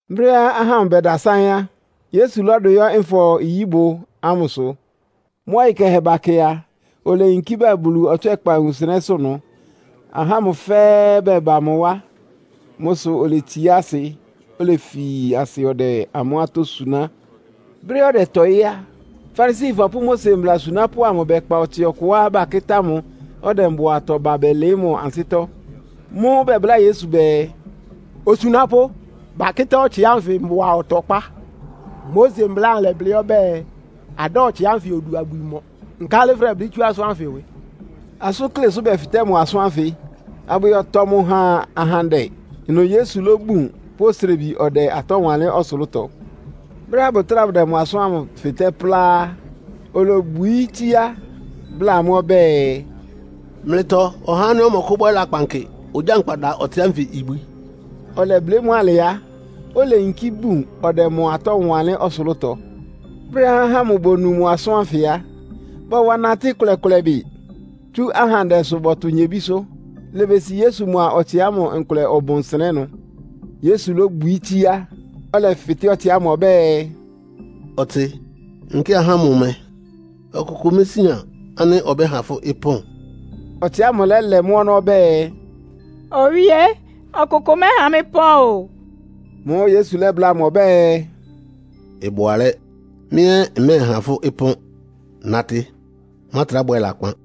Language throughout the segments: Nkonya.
Brɛ́á ahá amʋ bɛdasáɩ́n á, Yesu lɔ́dʋ yɔ́ Nfɔ-nyíbʋ ámʋsʋ. Mʋ́ ɔyɩ kɛhɛ bakɛ a, oleyinkí ba Bulu ɔtswɛ́kpa wunsɩnɛ́sʋ́ ɩnʋ. Ahá ámʋ fɛ́ɛ́ bɛba mʋ wá. Mʋ́ sʋ oletsiá asɩ, olefi asɩ ɔdɛ amʋ́ atɔ́ suná. Brɛ́á ɔdɛtɔɩ́ á, Farisifɔ pʋ́ Mose mbla asunápʋ́ amʋ bɛkpa ɔtsɩ ɔkʋá bakɩ́tá mʋ, ɔdɛ mbʋatɔ ba bɛlɩɩ́ amʋ́ ansɩ́tɔ́. Mʋ́ʋ́ bɛbláa Yesu bɛɛ, “Osunápʋ́, bakɩ́tá ɔtsɩ ánfɩ mbʋa ɔtɔkpá. Mose Mbla ámʋ lɛ́blɩ́ ɔbɛ́ɛ, adáa atsɩ ánfɩ odu abwi mɔ. Nkálɩ fʋdɛblɩ́ tsú asʋ́n ánfɩ ɩwɩ?” Asʋ́nklé sʋ́ bɛfɩtɛ́ mʋ asʋ́n ánfɩ, abʋyɔtɔ mʋ ha ahandɛ. Ɩnʋ Yesu lóbun, pʋ́ osrebi ɔdɛ atɔ́ wanlɩ́n ɔsʋlʋ́tɔ. Brɛ́á bʋtráa bʋdɛ asʋ́n ámʋ fɩtɛ́ plá á, olobwií tsíá, bláa amʋ́ ɔbɛ́ɛ, “Mlɩtɔ ɔhá ánɩ́ ɔmɔkʋ́bwɛ́ lakpan kɩ ogyánkpa da ɔtsɩ ánfɩ ibwi.” Ɔlɛblɩ́ mʋ́ alɩ á, oleyinkí bun ɔdɛ mʋ atɔ́ wanlɩ́n ɔsʋlʋ́tɔ. Brɛ́á ahá ámʋ bonu mʋ asʋ́n ánfɩ á, bɔwa natɩ́ ɩkʋlɛ-kʋlɛ bɩ, tsú ahandɛsʋ bɔtʋ nyebísʋ́. Ilebesi Yesu mʋa ɔtsɩ ámʋ nkʋlɛ ɔbʋn nsɩnɛ́ ɩnʋ. Yesu lóbwií tsíá, ɔlɛfɩtɛ́ ɔtsɩ ámʋ ɔbɛ́ɛ, “Ɔtsɩ, nkɩ́ɩ ahá ámʋ mɛ? Ɔkʋkʋ mésían ánɩ́ ɔbɛ́ha fʋ́ ɩpɔ́n?” Ɔtsɩ ámʋ lɛ́lɛ́ mʋ́ ɔnɔ́ ɔbɛ́ɛ, “Owíé! Ɔkʋkʋ mɛ́ha mɩ́ pɔ́n o!” Mʋ́ʋ́ Yesu lɛ́bláa mʋ ɔbɛ́ɛ, “Ɩbʋ alɛ́! Mɩ́ ɛ́ mmɛ́ɛha fʋ́ ɩpɔ́n! Natɩ, mátrá bwɛ lakpan.”]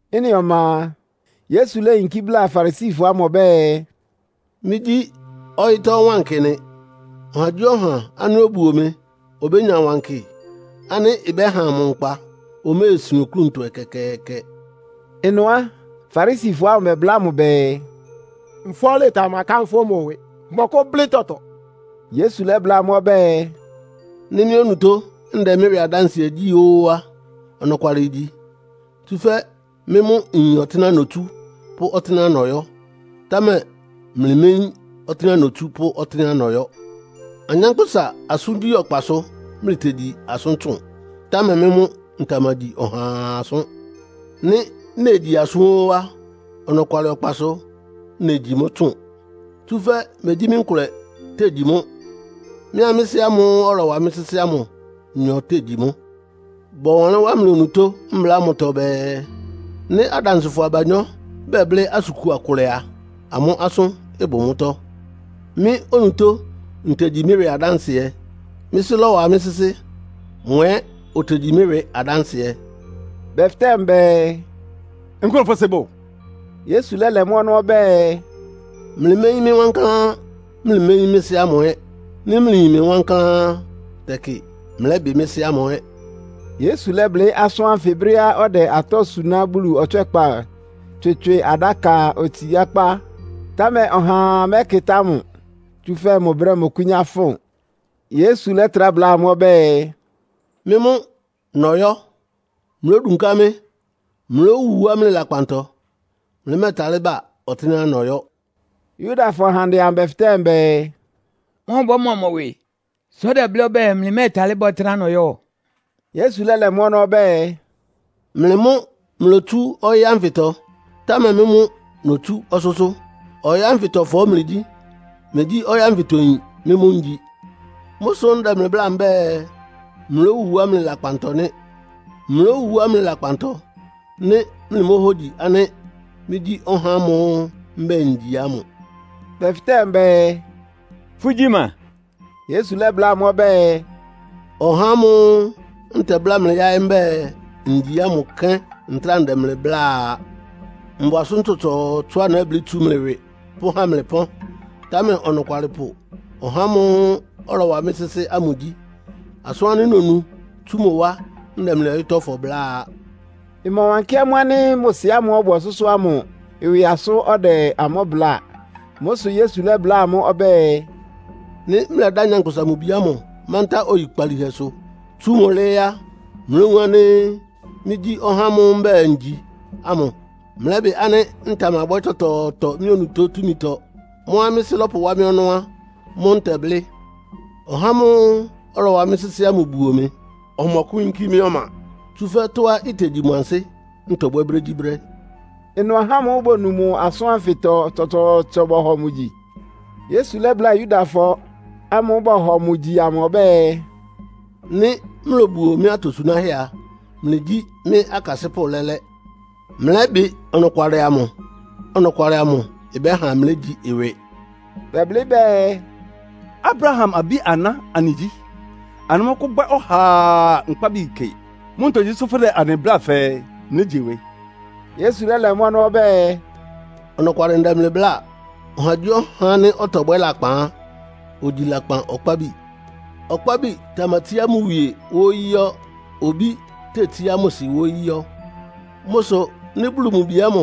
Ɩ́nɩ ɔma a, Yesu léyinkí bláa Farisifɔ ámʋ ɔbɛ́ɛ, “Mɩ́gyí ɔyɩ́tɔ́ wankɩ nɩ. Ɔhagyíɔha ánɩ́ obuo mɩ obénya wankɩ ánɩ́ ɩbɛ́ha mʋ nkpa, oméesin oklúntɔ ɛkɛkɛɛkɛ.” Ɩnʋ á, Farisifɔ ámʋ bɛbláa mʋ bɛɛ, “Nfɔ́lɩ tamakánfʋ́ mʋ ɩwɩ. Fʋmɔkʋ́blɩ́ tɔtɔ.” Yesu lɛ́bláa amʋ́ ɔbɛ́ɛ, “Nɩ́ mɩ́ onutó ndɛ mɩ́ ɩwɩ adánsɩɛ gyí ó á, ɔnɔkwalɩ igyi. Tsúfɛ́ mɩ́ mʋ́ nyin ɔtɩ́nɛ́á notsú pʋ́ ɔtɩ́nɛ́á nɔyɔ́. Támɛ mlɩméyín ɔtɩ́nɛ́á notsú pʋ́ ɔtɩ́nɛ́á nɔyɔ́. Anyánkpʋ́sa asʋ́ngyí ɔkpasʋ mlɩtegyi asʋ́n tsʋn, támɛ mɩ́ mʋ́ ntamagyi ɔhaa asʋ́n. Nɩ́ negyi asʋ́n ó á, ɔnɔkwalɩ ɔkpasʋ negyi mʋ́ tsʋn. Tsúfɛ́ megyí mɩ́ nkʋlɛ tegyi mʋ́. Mɩ́a mɩ́ Sɩ́ ámʋ́ʋ́ ɔlɔwa mɩ́ sɩ́sɩ́ ámʋ nyɔ tegyi mʋ́. Bɔwanlɩ́n wá mlɩ onutó Mbla ámʋtɔ bɛɛ, ‘Nɩ́ adansɩfɔ abanyɔ́ bɛblɩ́ asʋn kua kʋlɛ a, amʋ́ asʋ́n ɩbʋ mʋ́tɔ́.’ Mɩ́ onutó ntegyi mɩ́ ɩwɩ adánsɩɛ. Mɩ́ Sɩ́ lɔ́wa mɩ́ sɩ́sɩ́. Mʋ ɛ́ otegyi mɩ́ ɩwɩ adánsɩɛ.” Bɛfɩtɛ́ mʋ bɛɛ, “Nkʋ́nʋ́ fʋ́ sɩ́ bʋ?” Yesu lɛ́lɛ mʋ́ ɔnɔ́ ɔbɛ́ɛ, “Mlɩméyín mɩ́ wankláán, mlɩméyín mɩ́ Sɩ́ ámʋ ɛ́. Nɩ́ mlɩyin mɩ wankláán á, tɛkɩ mlɛ́bɩ mɩ́ Sɩ́ ámʋ ɛ́.” Yesu lɛ́blɩ́ asʋ́n ánfɩ brɛ́á ɔdɛ atɔ́ suná Bulu ɔtswɛ́kpa tswɩtswɩ adáka otsiákpá. Támɛ ɔhaa mɛ́kɩtá mʋ, tsúfɛ́ mʋ brɛ́ mɔkʋ́nyá fʋn. Yesu lɛ́trá bláa amʋ́ ɔbɛ́ɛ, “Mɩ́ mʋ́ nɔyɔ́. Mlódunká mɩ́. Mlówu wá mlɩ lakpantɔ. Mlɩmɛ́ɛtalɩ́ ba ɔtɩ́nɛ́á nɔyɔ́.” Yudafɔ ahandɛ amʋ bɛfɩtɛ́ bɛɛ, “Mɔ́ ɔbɔ́mɔ mʋ ɩwɩ, sʋ́ ɔdɛblɩ́ ɔbɛ́ɛ, mlɩmɛ́ɛtalɩ́ ba ɔtɩ́nɛ́á nɔyɔ́?” Yesu lɛ́lɛ mʋ́ ɔnɔ́ ɔbɛ́ɛ, “Mlɩ mʋ́ mlotsú ɔyɩ́ ánfɩtɔ, támɛ mɩ́ mʋ́ notsú ɔsʋ́sʋ́. Ɔyɩ́ ánfɩtɔfɔ mlɩgyí. Mmegyí ɔyɩ́ ánfɩtɔyin mɩ́ mʋ́ ngyi. Mʋ́ sʋ́ ndɛ mlɩ bláa mbɛ́ɛ, mlówu wá mlɩ lakpantɔ nɩ́. Mlówu wá mlɩ lakpantɔ, nɩ́ mlɩmóhógyi ánɩ́ ‘Mɩ́gyí ɔhá ámʋ́ʋ́ mbɛ́ɛ ngyi ámʋ.’” Bɛfɩtɛ́ mʋ bɛɛ, “Fʋ́gyí ma?” Yesu lɛ́bláa amʋ́ ɔbɛ́ɛ, “Ɔhá ámʋ́ʋ́ ntɛbláa mlɩ yáɩ́ mbɛ́ɛ, ngyi ámʋ kɛ́n ntráa ndɛ mlɩ bláa a. Mbʋ asʋ́n tsɔtsɔɔtsɔá nɛ́blɩ́ tsú mlɩ ɩwɩ pʋ́há mlɩ pɔ́n. Támɛ ɔnɔkwalɩpʋ ɔhá ámʋ́ʋ́ ɔlɔwa mɩ́ sɩ́sɩ́ ámʋ gyí. Asʋ́n ánɩ́ nonu tsú mʋ wá ndɛ mlɩ ɔyɩ́tɔ́fɔ bláa.” Ɩmɔwankɩ́ amʋ́ ánɩ́ mʋ Sɩ ámʋ́ʋ́ ɔbʋ ɔsʋ́sʋ́ ámʋ ɩwɩ asʋ́n ɔdɛ amʋ́ bláa. Mʋ́ sʋ Yesu lɛ́bláa amʋ́ ɔbɛ́ɛ, “Nɩ́ mlɛdá Nyankpʋsa-Mʋ-Bi ámʋ mántá oyikpalíhɛsʋ, tsú mʋ́ lɩ́ɩ́ á, mlówun ánɩ́ ‘Mɩ́gyí ɔhá ámʋ́ʋ́ mbɛ́ɛ ngyi’ ámʋ. Mlɛ́bɩ ánɩ́ ntamabwɛ́ tɔtɔɔtɔ mɩ́ onutó túmitɔ. Mʋ́á mɩ́ Sɩ́ lɔ́pʋwá mɩ ɔnɔ́ á, mʋ́ ntɛblɩ́. Ɔhá ámʋ́ʋ́ ɔlɔwa mɩ́ sɩ́sɩ́ ámʋ buo mɩ. Ɔmɔkʋ́yínkí mɩ́ ɔma, tsúfɛ́ tɔ́á itegyi mʋ ansɩ́ ntɔbwɛ́ brégyíbrɛ́.” Ɩnʋ ahá ámʋ́ʋ́ bonu mʋ asʋ́n ánfɩtɔ tsɔtsɔɔtsɔ bɔhɔ mʋ gyi. Yesu lɛ́bláa Yudafɔ ámʋ́ʋ́ bɔhɔ mʋ gyi amʋ ɔbɛ́ɛ, “Nɩ́ mlobuo mɩ́ atosunáhɛ́ a, mlɩgyí mɩ́ akasɩ́pʋ́ lɛ́lɛ́. Mlɛ́bɩ ɔnɔkwalɩ amʋ. Ɔnɔkwalɩ amʋ ɩbɛ́ha mlégyi ɩwɩ.” Bɛblɩ́ bɛɛ, “Abraham abí-aná anɩgyí. Anɩmɔ́kʋ́bwɛ́ ɔhaa nkpábi kɩ. Mʋ́ ntogyi sʋ́ fʋ́dɛ anɩ bláa fɛɛ, ‘Mlégyi ɩwɩ?’” Yesu lɛ́lɛ mʋ́ ɔnɔ́ ɔbɛ́ɛ, “Ɔnɔkwalɩ ndɛ mlɩ bláa. Ɔhagyíɔha ánɩ́ ɔtɔbwɛ́ lakpan á, ogyi lakpan ɔkpábi. Ɔkpábi tamatsíá mʋ wie wóyí yɔ́, obí tetsíá mʋ sɩ wóyí yɔ́. Mʋ́ sʋ nɩ́ Bulu mʋ Bi ámʋ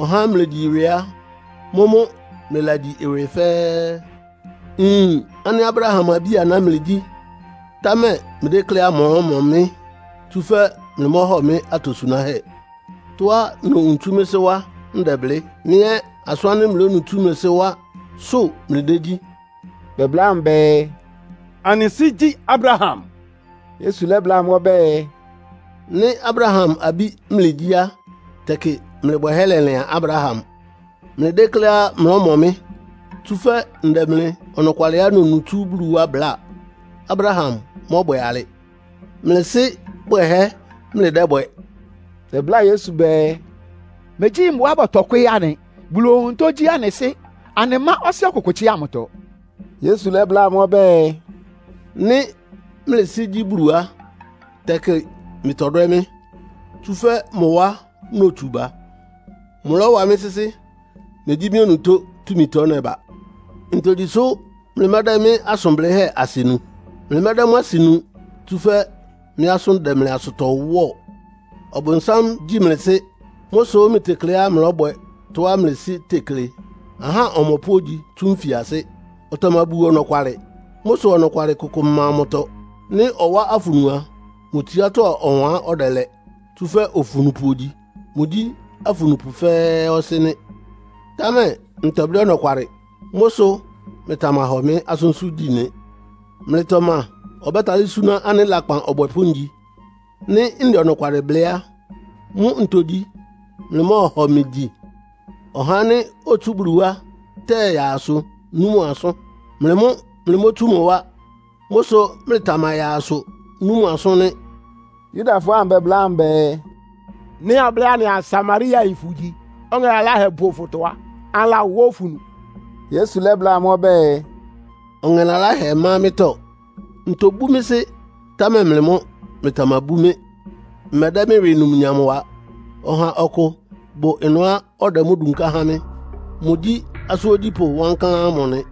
ɔhá mlegyi ɩwɩ á, mʋ́mʋ́ mlɩlagyi ɩwɩ fɛ́ɛ́. Nyin ánɩ́ Abraham abí-aná mlɩgyí, támɛ mlɩdékléá mlɔ́mɔ mɩ́, tsúfɛ́ mlɩmɔ́hɔ mɩ́ atosunáhɛ́. Tɔ́á nowun tsu mɩ́ Sɩ́ wá ndɛblɩ́. Mlɩ ɛ́ asʋ́n ánɩ́ mlɩlónu tsú mlɩ sɩ́ wásʋ́ mlɩdégyí.” Bɛbláa mʋ bɛɛ, “Anɩ sɩ́ gyí Abraham.” Yesu lɛ́bláa amʋ́ ɔbɛ́ɛ, “Nɩ́ Abraham abí mlɩgyí á, tɛkɩ mlɩ bwɛhɛ́ lɛlɩan Abraham. Mlɩdékléá mlɔ́mɔ mɩ́, tsúfɛ́ ndɛ mlɩ ɔnɔkwalɩá nonu tsú Bulu wá bláa. Abraham mɔ́bwɛ alɩ! Mlɩ sɩ́ bwɛhɛ́ mlɩdɛ́bwɛ.” Bɛbláa Yesu bɛɛ, “Megyí mbʋa bɔtɔ kwɩ́ɩ́ anɩ. Bulu onutó gyí anɩ Sɩ́. Anɩmá ɔsɩ́ ɔkʋkʋ tsɩ́a mʋtɔ.” Yesu lɛ́bláa amʋ́ ɔbɛ́ɛ, “Nɩ́ mlɩ Sɩ́ gyí Bulu á, tɛkɩ mlɩtɔdwɛ́ mɩ́, tsúfɛ́ mʋ wá notsu ba. Mʋlɔ́wa mɩ́ sɩ́sɩ́. Megyí mɩ́ onutó túmitɔ nɛba. Ntogyi sʋ́ mlɩmɛ́dɛ́ mɩ́ asʋn blɩ́hɛ́ asɩ nu? Mlɩmɛ́dɛ́ mʋ́ asɩ nu, tsúfɛ́ mɩ́ asʋ́n dɛ mlɩ asʋtɔ wɔ́ɔ. Ɔbʋnsám gyí mlɩ sɩ́. Mʋ́ sʋ mlɩtekleá mlɔ́bwɛ tɔ́á mlɩ sɩ́ tekle. Ahá ɔmɔpʋ́ ogyi tsú nfiasɩ́. Ɔtamabuo ɔnɔkwalɩ. Mʋ́ sʋ ɔnɔkwalɩ kʋkʋ ɩma mʋtɔ. Nɩ́ ɔwá afunu a, mʋ tsiátɔ́ ɔwan ɔdɛlɛ, tsúfɛ́ ofunupʋ ogyi. Mʋgyí afunupʋ fɛ́ɛ́ ɔsɩ́ nɩ́. Támɛ ntɛblɩ́ ɔnɔkwalɩ. Mʋ́ sʋ mlɩtamahɔ mɩ́ asʋ́nsʋ́ gyi nɩ. Mlɩtɔ ma ɔbɛ́talɩ́ súná ánɩ́ lakpan ɔbwɛpʋ́ ngyi? Nɩ́ ndɛ ɔnɔkwalɩ blɩ́ á, mʋ́ ntogyi mlɩmɔ́ɔhɔ mɩ gyi? Ɔhá ánɩ́ otsú Bulu wá tɛyáá asʋ nú mʋ asʋ́n. Mlɩ mʋ́ mlɩmótsú mʋ wá. Mʋ́ sʋ mlɩtamayáá asʋ nú mʋ asʋ́n nɩ́.” Yudafɔ ámʋ bɛbláa mʋ bɛɛ, “Nɩ́ ablɩ́ anɩaa Samariayin fʋgyi, ɔŋɛ laláhɛ bʋ fʋtɔ á, anɩlawá afunu?” Yesu lɛ́bláa amʋ́ ɔbɛ́ɛ, “Ɔŋɛ laláhɛ ma mɩ́tɔ́. Ntobú mɩ́ Sɩ́, támɛ mlɩ mʋ́ mlɩtamabú mɩ́. Mmɛdɛ́ mɩ́ ɩwɩ numnyam wa. Ɔha ɔkʋ bʋ ɩnʋá ɔdɛ mʋ́ dunká há mɩ́. Mʋgyí asʋ́n ogyípʋ́ wankláán ámʋ nɩ.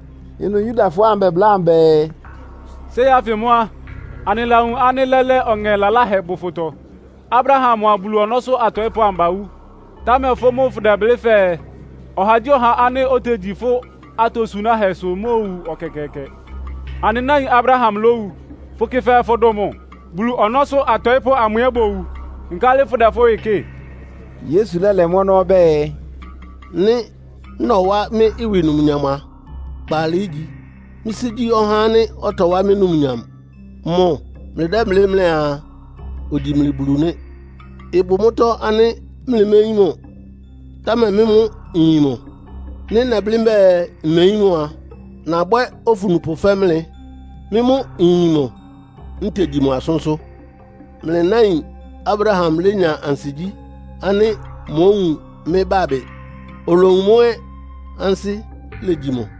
Ɩnʋ Yudafɔ ámʋ bɛbláa mʋ bɛɛ, “Séi ánfɩ mʋ́ á, anɩlawun ánɩ́ lɛ́lɛ́ ɔŋɛ laláhɛ bʋ fʋtɔ! Abraham mʋa Bulu ɔnɔ́sʋ́ atɔɩ́pʋ́ amʋ bawú. Támɛ fʋ́ mʋ́ fʋdɛblɩ́ fɛɛ, ɔhagyíɔha ánɩ́ otegyi fʋ́ atosunáhɛ́sʋ omóowu ɛkɛkɛɛkɛ. Anɩ náin Abraham lówu. Fʋkɩ fɛɛ fʋdʋn mʋ? Bulu ɔnɔ́sʋ́ atɔɩ́pʋ́ amʋ ɛ́ bowu. Nkálɩ fʋ́dɛ fʋ́ ɩwɩ kɩ́ɩ?” Yesu lɛ́lɛ mʋ́ ɔnɔ́ ɔbɛ́ɛ, “Nɩ́ nɔwá mɩ́ ɩwɩ numnyam a, kpaalɩ ígyi. Mɩ́ Sɩ́ gyí ɔhá ánɩ́ ɔtɔwá mɩ́ numnyam. Mʋ mlɩdɛ́blɩ́ mlɩaa ogyi mlɩ Bulu nɩ́. Ɩbʋ mʋ́tɔ́ ánɩ́ mlɩméyín mʋ, támɛ mɩ́ mʋ́ nyin mʋ. Nɩ́ nɛblɩ́ mbɛ́ɛ mmeyín mʋ a, nabwɛ́ ofunupʋ fɛ́ mlɩ. Mɩ́ mʋ́ nyin mʋ, ntegyi mʋ asʋ́nsʋ́. Mlɩ náin Abraham lénya ansigyí ánɩ́ mówun mɩ́ bábɩ. Olowun mʋ́ ɛ́, ansɩ́ legyi mʋ.”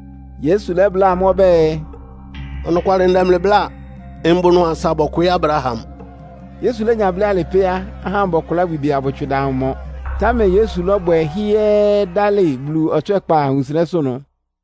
Yesu lɛ́bláa amʋ́ ɔbɛ́ɛ, “Ɔnɔkwalɩ ndɛ mlɩ bláa. Mbʋ ɩnʋ asa bɔkwɩɩ́ Abraham.” Yesu lénya blɩ́ alɩ pɛ́, ahá ámʋ bɔkʋlá abwi bɛɛ abʋtswɩ da mʋ mɔ. Támɛ Yesu lɔ́bwɛ hɩ́ɛ́ɛ́, dálɩ Bulu ɔtswɛ́kpa wunsɩnɛ́sʋ́ ɩnʋ.